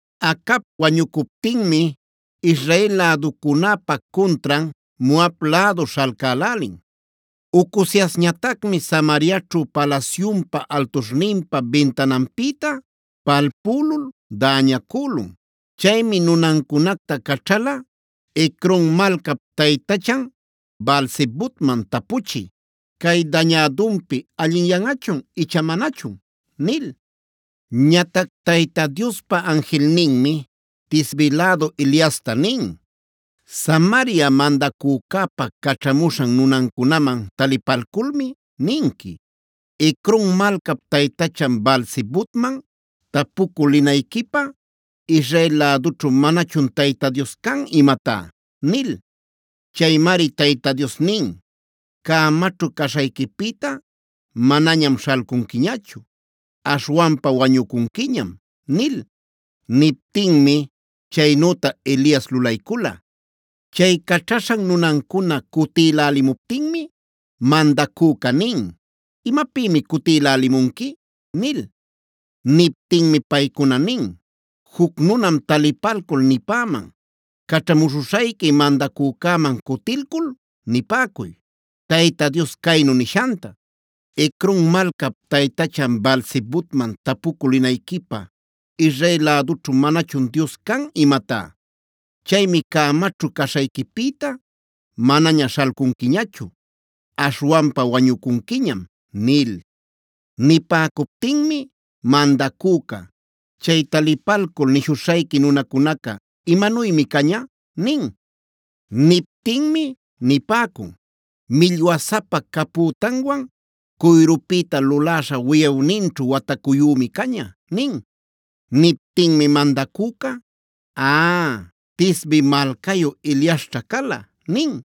Acab wañucuptinmia Israel läducunäpa cuntran Moab lädu śhalcälälin. Ocoziasñatacmib Samariaćhu palasyunpa altuśhninpa bintananpïta palpülul däñacülun. Chaymi nunancunacta caćhala Ecron malcap taytachan Baal-zebubman tapuchï: “Cay dañädunpi allinyanꞌachun icha manachun” nil. Ñatac Tayta Diospa anjilninmi Tisbe lädu Eliasta nin: “Samaria mandacücäpa caćhamuśhan nunancunaman talipalculmi ninqui: ‘¿¡Ecron malcap taytachan Baal-zebubman tapucü linayquipä Israel lädućhu manachun Tayta Dios can imatá!?’ nil. Chaymari Tayta Dios nin: ‘Cämaćhu caśhayquipïta manañam śhalcunquiñachu. Aśhwanpa wañucunquiñam’” nil. Niptinmi chaynüta Elias lulaycula. Chay caćhaśhan nunancuna cutïlälimuptinmi mandacüca nin: “¿Imapïmi cutïlälimunqui?” nil. Niptinmi paycuna nin: “Juc nunam talipalcul nipäman: ‘Caćhamuśhuśhayqui mandacücäman cutilcul nipäcuy Tayta Dios caynu nishanta: ¿¡Ecron malcap taytachan Baal-zebubman tapucü linayquipä Israel lädućhu manachun Dios can imatá!? Chaymi cämaćhu caśhayquipïta manaña śhalcunquiñachu. Aśhwanpa wañucunquiñam’” nil. Nipäcuptinmi mandacüca: “Chay talipalcul nishuśhayqui nunacunaca ¿imanuymi caña?” nin. Niptinmi nipäcun: “Millwasapa capütanwan, cuyrupïta luläśha wiyawninćhu watacuyümi caña” nin.c Niptinmi mandacüca: “Aaa, Tisbe malcayu Eliasćha cala” nin.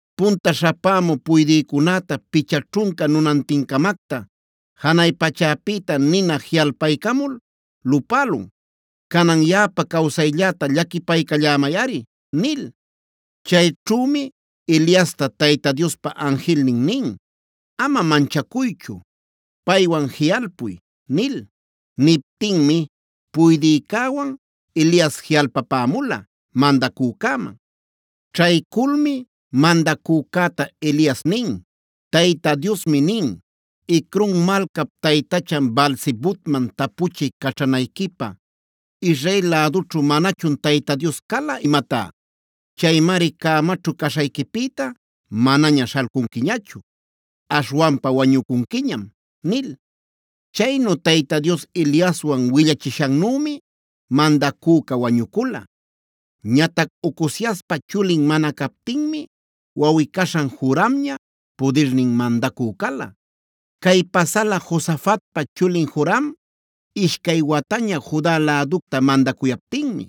Punta śhapämü puydïcunäta picha ćhunca nunantincamactam janay pachäpïta nina jiꞌalpaycamul lupälun. Canan yaꞌapa cawsaylläta llaquipaycallämayꞌari” nil. Chayćhümi Eliasta Tayta Diospa anjilnin nin: “Ama manchacuychu; paywan jiꞌalpuy” nil. Niptinmi puydïcäwan Elias jiꞌalpapämula mandacücäman. Ćhayculmi mandacücäta Elias nin: “Tayta Diosmi nin: ¿¡Ecron malcap taytachan Baal-zebubman tapuchï caćhanayquipä Israel lädućhu manachun Tayta Dios cala imatá!? Chaymari cämaćhu caśhayquipïta manaña śhalcunquiñachu; aśhwanpa wañucunquiñam” nil. Chaynu Tayta Dios Eliaswan willachishannümi mandacüca wañucula. Ñatac Ocoziaspa chulin mana captinmi wawꞌi-caśhan Joramña pudirnin mandacü cala. Cay pasala Josafatpa chulin Joram ishcay wataña Juda läducta mandacuyaptinmi.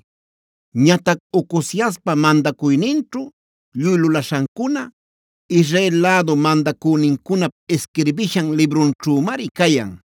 Ñatac Ocoziaspa mandacuyninćhu lluy lulaśhancuna Israel lädu mandacünincunap isquirbishan librunćhümari cayan.